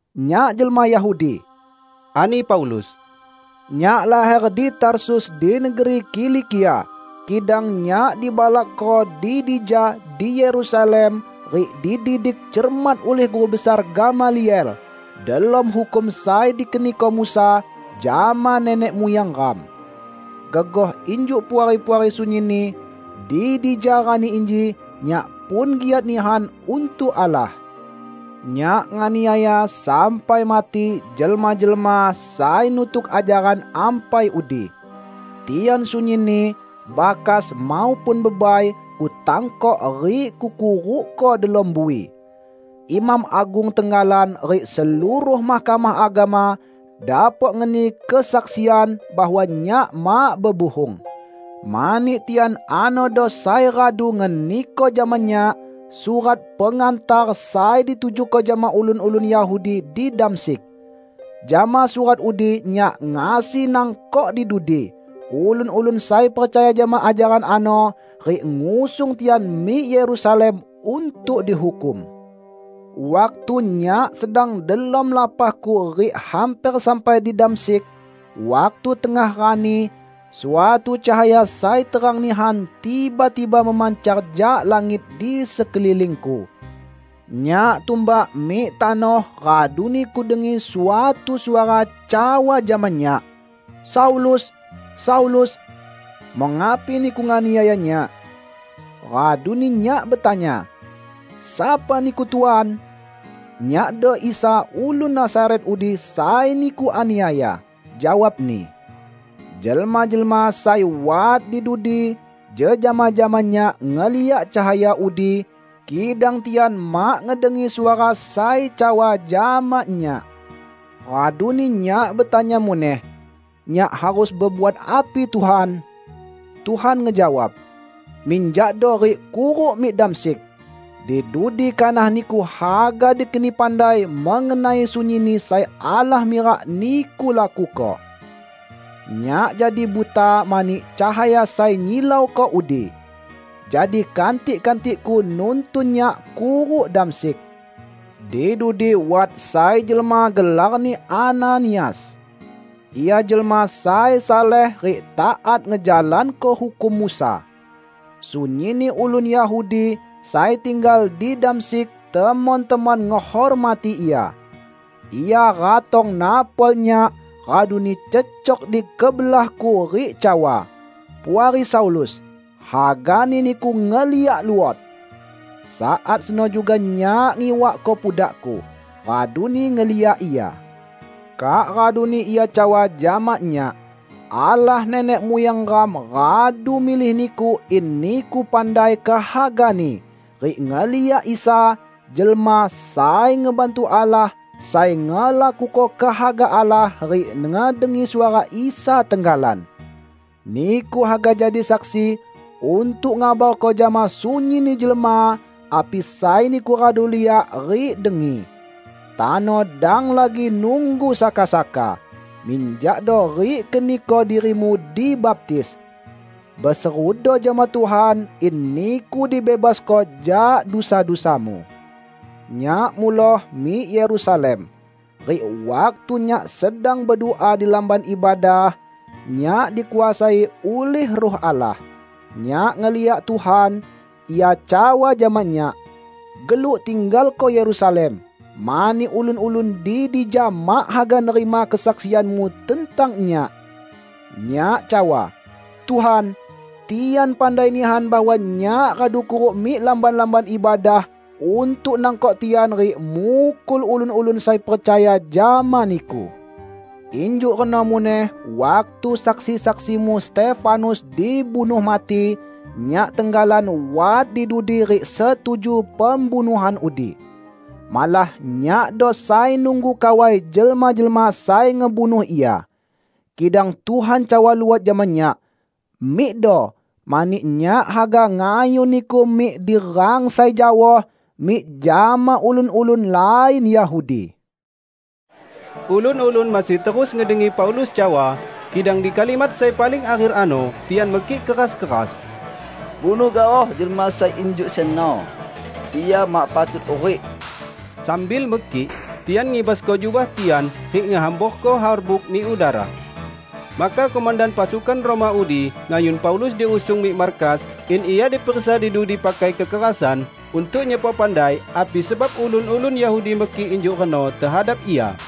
"Nyak jelma Yahudi," ani Paulus, "nyak laher di Tarsus di negeri Kilikia, kidang nyak dibalakko di dija di Yerusalem rik dididik cermat ulih guru besar Gamaliel delom hukum sai dikeniko Musa jama nenek muyang ram. Gegoh injuk Puari-puari sunyinni di dija rani inji, nyak pun giat nihan untuk Allah. Nyak nganiaya sampai mati jelma-jelma sai nutuk ajaran ampai udi. Tian sunyinni, bakas maupun bebai, kutangkok rik kukurukko delom bui. Imam agung tenggalan rik seluruh Mahkamah Agama dapok ngeni kesaksian bahwa nyak mak bebuhung. Mani tian anodo sai radu ngeniko jama nyak surat pengantar sai ditujuko jama ulun-ulun Yahudi di Damsyik. Jama surat udi nyak ngasi nangkok di dudi ulun-ulun sai percaya jama ajaran ano, rik ngusung tian mik Yerusalem untuk dihukum." "Waktu nyak sedang delom lapahku rik hamper sampai di Damsyik, waktu tengah rani, suatu cahaya sai terang nihan tiba-tiba memancar jak langit di sekelilingku. Nyak tumbak mik tanoh raduni kudengi suatu suara cawa jama nyak, 'Saulus, Saulus! Mengapi niku nganiaya Nyak?' Raduni nyak betanya, 'Sapa Niku, Tuan?' 'Nyakdo Isa ulun Nazaret udi sai niku aniaya,' jawab-Ni. Jelma-jelma sai wat di dudi jejama jama nyak ngeliak cahaya udi, kidang tian mak ngedengi suara sai cawa jama nyak. Raduni nyak betanya muneh, 'Nyak harus bebuat api, Tuhan?' Tuhan ngejawab, 'Minjakdo rik kuruk mik Damsyik. Di dudi kanah niku haga dikeni pandai mengenai sunyinni sai Allah mirak niku lakuko.' Nyak jadi buta mani cahaya sai nyilauko udi. Jadi kantik-kantikku nuntun nyak kuruk Damsyik. Di dudi wat sai jelma gelarni Ananias. Ia jelma sai saleh rik taat ngejalanko hukum Musa. Sunyinni ulun Yahudi sai tinggal di Damsyik temon-temon ngehormati ia. Ia ratong napol nyak, raduni cecok di kebelahku rik cawa, 'Puari Saulus, hagani niku ngeliak luot!' Saat seno juga nyak ngiwakko pudakku, raduni ngeliak ia. Kak raduni ia cawa jama nyak, 'Allah nenek muyang ram radu milih niku in niku pandai kehaga-Ni, rik ngeliak Isa, Jelma Sai Ngebantu Allah sai ngelakuko kehaga Allah rik ngedengi suara Isa tenggalan. Niku haga jadi saksi untuk ngabarko jama sunyinni jelma api sai niku radu liak rik dengi. Tano dang lagi nunggu saka-saka. Minjakdo rik keniko dirimu dibaptis. Beserudo jama Tuhan in niku dibebasko jak dusa-dusamu.' " "Nyak muloh mik Yerusalem, rik waktu nyak sedang bedua di Lamban Ibadah, nyak dikuasai ulih Ruh Allah. Nyak ngeliak Tuhan; Ia cawa jama nyak, 'Geluk tinggalko Yerusalem, mani ulun-ulun di dija mak haga nerima kesaksianmu tentang Nyak.' Nyak cawa, 'Tuhan, tian pandai nihan bahwa nyak radu kuruk mik lamban-lamban ibadah untuk nangkok tian rik mukul ulun-ulun sai percaya jama Niku. Injuk reno muneh waktu saksi-saksi-Mu Stefanus dibunuh mati, nyak tenggalan wat di dudi rik setuju pembunuhan udi. Malah nyakdo sai nunggu kawai jelma-jelma sai ngebunuh ia.' Kidang Tuhan cawa luot jama nyak, 'Mikdo, mani Nyak haga ngayun niku mik di rang sai jaoh mik jama ulun-ulun lain Yahudi.' " Ulun-ulun masih terus ngedengi Paulus cawa, kidang di kalimat sai paling akher ano tian mekik keras-keras, "Bunuh gaoh jelma sai injuk seno. Ia mak patut hurik!" Sambil mekik, tian ngibasko jubah tian, rik ngehamborko harbuk mik udara. Maka komandan pasukan Roma udi ngayun Paulus diusung mik markas in ia diperiksa di dudi pakai kekerasan untuk nyepok pandai api sebab ulun-ulun Yahudi mekik injuk reno tehadap ia.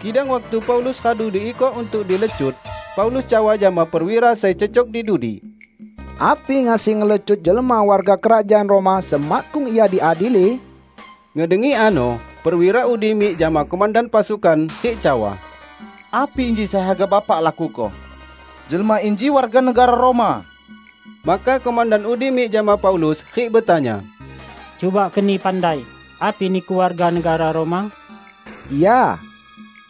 Kidang waktu Paulus radu diikok untuk dilecut, Paulus cawa jama perwira sai cecok di dudi, "Api ngasi ngelecut jelma warga kerajaan Roma semakkung ia diadili?" Ngedengi ano, perwira udi mik jama komandan pasukan rik cawa, "Api inji sai haga Bapak lakuko? Jelma inji warga negara Roma!" Maka komandan udi mik jama Paulus rik betanya, "Cuba keni pandai, api niku warga negara Roma!" "Ya,"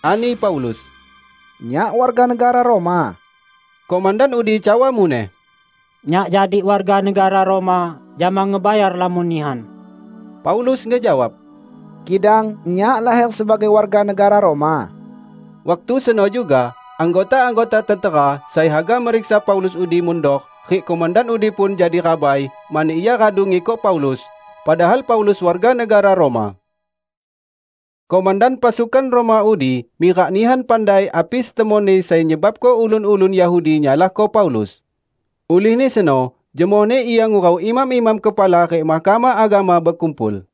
ani Paulus, "nyak warga negara Roma." Komandan udi cawa muneh, "Nyak jadi warga negara Roma jama ngebayar lamon nihan!" Paulus ngejawab, "Kidang nyak laher sebagai warga negara Roma." Waktu seno juga anggota-anggota tentera sai haga meriksa Paulus udi mundor rik komandan udi pun jadi rabai mani ia radu ngikok Paulus, padahal Paulus warga negara Roma. Komandan pasukan Roma udi mirak nihan pandai api setemonni sai nyebabko ulun-ulun Yahudi nyalahko Paulus. Ulihni seno jemohni ia ngurau imam-imam kepala rik Mahkamah Agama bekumpul.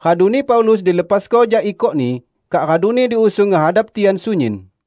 Raduni Paulus dilepasko jak ikokni, kak raduni diusung ngehadap tian sunyin.